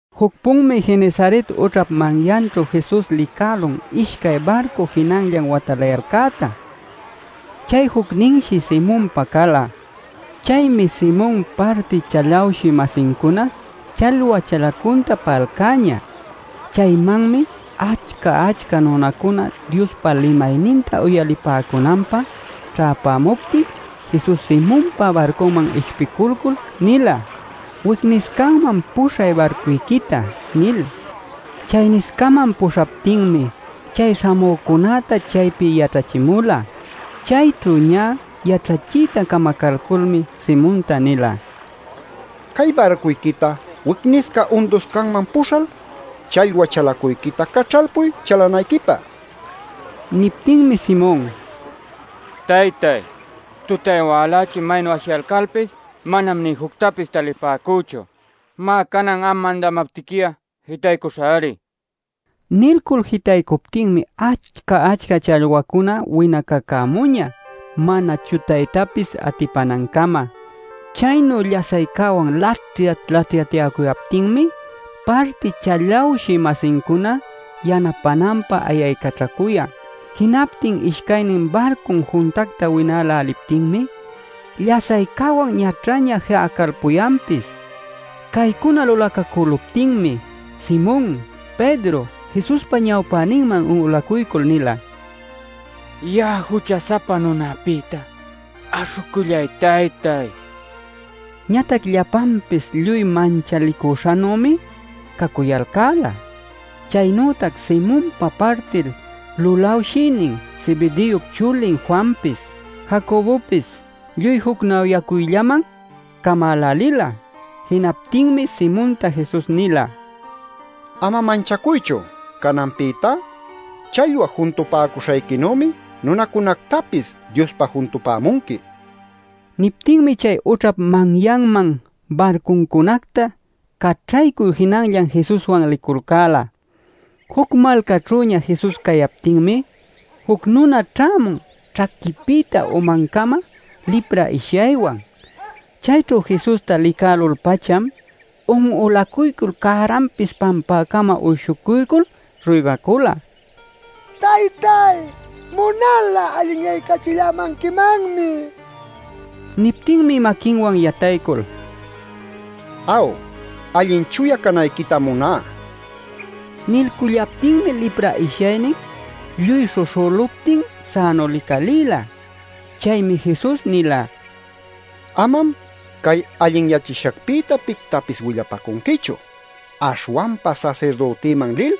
Juc-punmi Genesaret ućhap manyanćhu Jesus licälun ishcay barcu jinanllan watalayalcäta. Chay jucninshi Simonpa cala. Chaymi Simon parti chalawshï-masincuna challwa chalacunta pa'alcäñä. Chaymanmi achca-achca nunacuna Diospa limayninta uyalipäcunanpä ćhäpämuptin Jesus Simonpa barcunman ishpiculcul nila: “Wicniscaman puśhay barcuyquita” nil. Chayniscaman puśhaptinmi chay śhamücunäta chaypi yaćhachimula. Chayćhu ñä yaćhachiyta camacalculmi Simonta nila: “Cay barcuyquita wicnisca unduscanman puśhal challwa chalacuyquita caćhalpuy chalanayquipä” nil. Niptinmi Simon: “Taytáy, tutay-walächi maynu ashiyalcalpis, manam nï juctapis talipäcüchu. Má, canan am mandamaptiqui'a jitaycuśhäri” nin. Nilcul jitaycuptinmi achca-achca challwacuna winacämuñä mana chutaypis atipanancama. Chaynu llasaycäwan laćhyat-laćhyatyäcuyaptinmi parti chalawshï-masincuna yanapänanpä ayaycaćhacuyan. Jinaptin ishcaynin barcun juntacta winäläliptinmi llasaycäwan ñaćhaña ji'acalpuyanpis. Caycuna lulacacüluptinmi Simon Pedro Jesuspa ñawpäninman un'ulacuycul nila: “Ya'a jucha-sapa nunapïta aśhucullay, taytáy” nil. Ñatac llapanpis lluy manchalicuśhanümi cacuyalcäla. Chaynütac Simonpa partil lulawshïnin Zebedeop chulin Juanpis, Jacobopis lluy jucnawyäcuyllaman camälälila. Jinaptinmi Simonta Jesus nila: “Ama manchacuychu. Cananpïtá challwa juntupäcuśhayquinümi nunacunactapis Diospä juntupämunqui” nil. Niptinmi chay ućhap manyanman barcuncunacta caćhaycul jinanllan Jesuswan liculcäla. Juc malcaćhüña Jesus cayaptinmi, juc nuna ćhämun ćhaquinpïta umancama lipra ishyaywan. Chayćhu Jesusta licälul-pacham, un'ulacuycul cäranpis pampäcama uyshucuycul ruygacula: “Taytáy, munal'a allinyaycachillämanquimanmi” nil. Niptinmi maquinwan yataycul: “Aw, allin chuya canayquitam muná” nila. Nilcullaptinmi lipra ishyaynin lluy śhuśhüluptin sänu licalïla. Chaymi Jesus nila: “Amam cay allinyachishacpïta pictapis willapacunquichu. Aśhwanpa sasirdütiman lil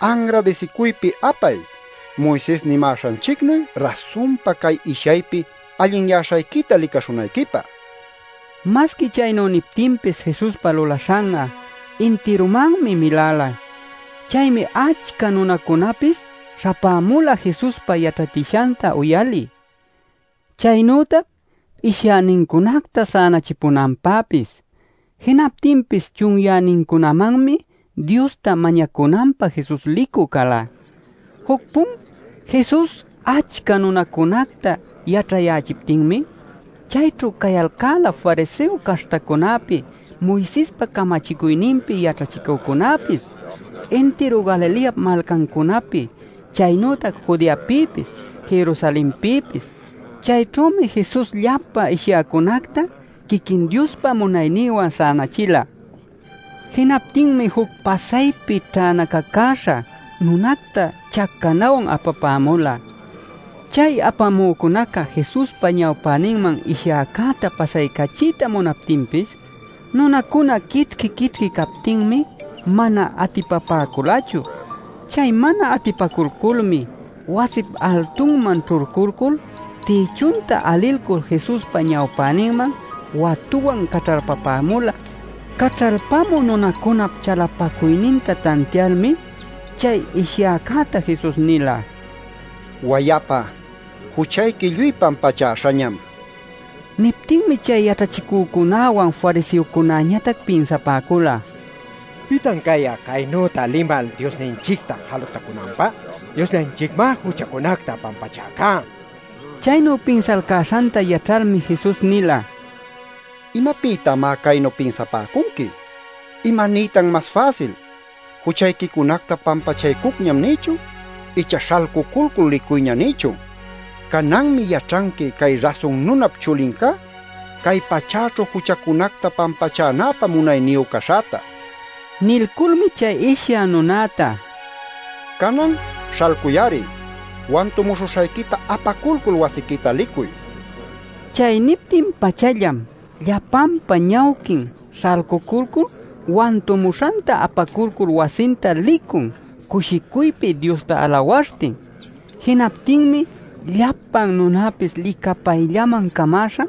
anradisicuypi apay Moises nimäśhanchicnuy rasunpa cay ishyaypi allinyäśhayquita licaśhunayquipä” nil. Masqui chaynu niptinpis Jesuspa lulaśhan'a intirumanmi miläla. Chaymi achca nunacunapis śhapämula Jesuspa yaćhachishanta uyalï, chaynütac ishyänincunacta sänachipunanpäpis. Jinaptinpis chunyänincunamanmi Diosta mañacunanpä Jesus licü cala. Juc-pun Jesus achca nunacunacta yaćhayächiptinmi, chayćhu cayalcäla fariseo caśhtacunapi, Moisespa camachicuyninpi yaćhachicücunäpis, intiru Galileap malcancunapi, chaynütac Judeapïpis, Jerusalenpïpis. Chayćhümi Jesus llapa ishyäcunacta quiquin Diospa munayninwan sänachila. Jinaptinmi juc pasaypi ćhänacacüśha nunacta chacanawan apapämula. Chay apamücunaca Jesuspa ñawpäninman ishyäcäta pasaycachiyta munaptinpis, nunacuna quićhqui-quićhqui captinmi mana atipapäculachu. Chay mana atipaculculmi, wasip altunman ćhulculcul tïchunta alilcul Jesuspa ñawpäninman watuwan caćhalpapämula. Caćhalpamü nunacunap chalapacuyninta tantialmi chay ishyäcäta Jesus nila: “Wayapa, juchayqui lluy pampachäśhañam” nil. Niptinmi chay yaćhachicücunawan fariseocunañatac pinsapäcula: “¿Pitan cay'a caynüta limal Diosninchicta jalutacunanpä? Diosllanchicmá juchacunacta pampachäca” nil. Chaynu pinsalcäśhanta yaćhalmi Jesus nila: “¿Imapïtamá caynu pinsapäcunqui? ¿Imaniytan mas fäsil: ‘Juchayquicunacta pampachaycucñam’ nïchun icha ‘Śhalcuculcul licuyña’ nïchun? Cananmi yaćhanqui cay Rasun Nunap Chulincá, cay pachäćhu juchacunacta pampachänäpä munayniyu caśhäta” nil. Nilculmi chay ishyä nunäta: “Canan ¡śhalcuy-ari! Wantumuśhuśhayquita apaculcul wasiquita licuy” nila. Chay niptin-pachallam llapanpa ñawquin śhalcuculcul wantumuśhanta apaculcul wasinta licun cushicuypi Diosta alawaśhtin. Jinaptinmi llapan nunäpis licapayllaman camäśha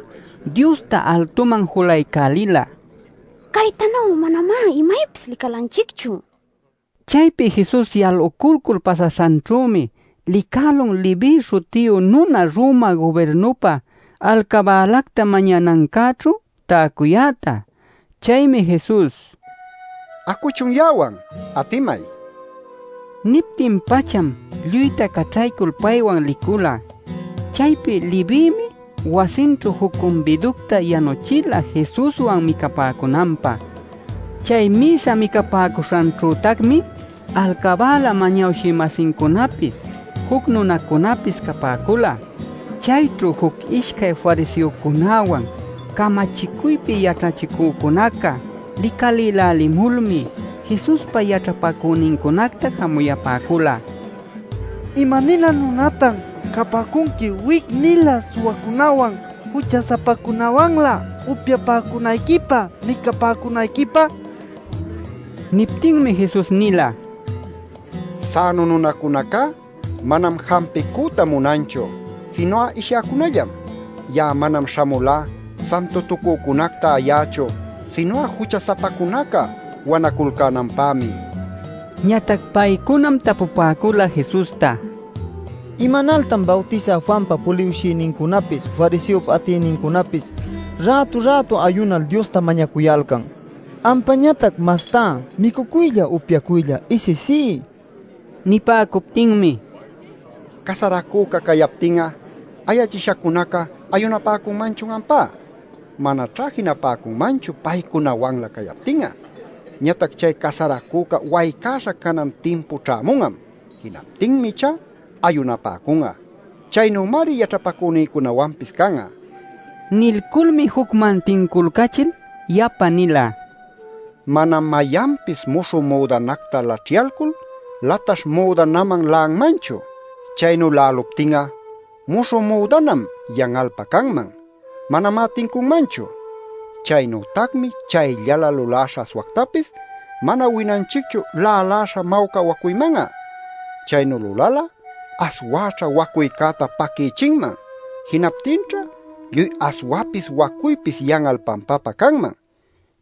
Diosta altuman julaycälila: “¡Caytanu'a manamá imaypis licalanchicchu!” nil. Chaypi Jesus yaluculcul pasaśhanćhümi licälun Leví śhutiyu nuna Roma gubirnupä alcabälacta mañanancäćhu täcuyäta. Chaymi Jesus: “Acuchun ya'awan, atimay” nin. Niptin-pacham lluyta caćhaycul paywan licula. Chaypi Levïmi wasinćhu juc cumbiducta yanuchila Jesuswan micapäcunanpä. Chay mïsa micapäcuśhanćhütacmi alcabäla mañawshï-masincunapis, juc nunacunapis capäcula. Chayćhu juc ishcay fariseocunäwan camachicuypi yaćhachicücunaca licalïlälimulmi Jesuspa yaćhapacünincunacta jamuyapäcula: “¡¿Ima-nilä nunatan capäcunqui wic-nilä suwacunawan jucha-sapacunawanlä upyapäcunayquipä micapäcunayquipä?!” nil. Niptinmi Jesus nila: “Sänu nunacunacá manam jampicüta munanchu, sinu'a ishyäcunallam. Ya'a manam śhamulá santutucücunacta ayächu, sinu'a jucha-sapacunaca wanaculcänanpämi” nil. Ñatac paycunam tapupäcula Jesusta: “¿Imanaltan Bawtisä Juanpa puliwshïnincunapis fariseop atïnincunapis rätu-rätu ayunal Diosta mañacuyalcan, ampañatac mastá micucuylla upyacuylla isisí?” nil. Nipäcuptinmi: “¿Casaracüca cayaptin'a ayachishacunaca ayunapäcunmanchun ampá? Manaćhá jinapäcunmanchu paycunawanlä cayaptin'a. Ñatac chay casaracüca waycäśha canan timpu ćhämun'am. Jinaptinmi ichá ayunapäcun'a. Chaynümari yaćhapacünïcunawanpis can'a” nil. Nilculmi jucman tinculcachil yapa nila: “Manam mayanpis muśhü müdanacta laćhyalcul, lataśh müdanaman la'anmanchu. Chaynu la'äluptin'a muśhü müdanam yan'alpä canman. Manamá tincunmanchu. “Chaynütacmi chayllalä luläśha aswactapis mana winanchicchu lälaśha mawca wacuyman'a. Chaynu lulal'a aswäćha wacuycäta paquïchinman; jinaptinćha lluy aswapis wacuypis yan'al pampapä canman.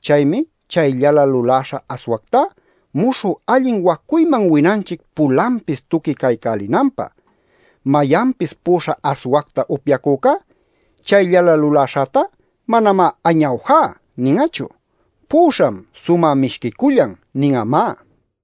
Chaymi chayllalä luläśha aswactá muśhü allin wacuyman winanchic pulanpis tuqui caycälinanpä. Mayanpis pu'uśha aswacta upyacücá chayllalä luläśhätá manamá ‘¡Añawjá!’ nin'achu. ‘Pu'uśham sumä mishquicullan’ nin'amá” nil.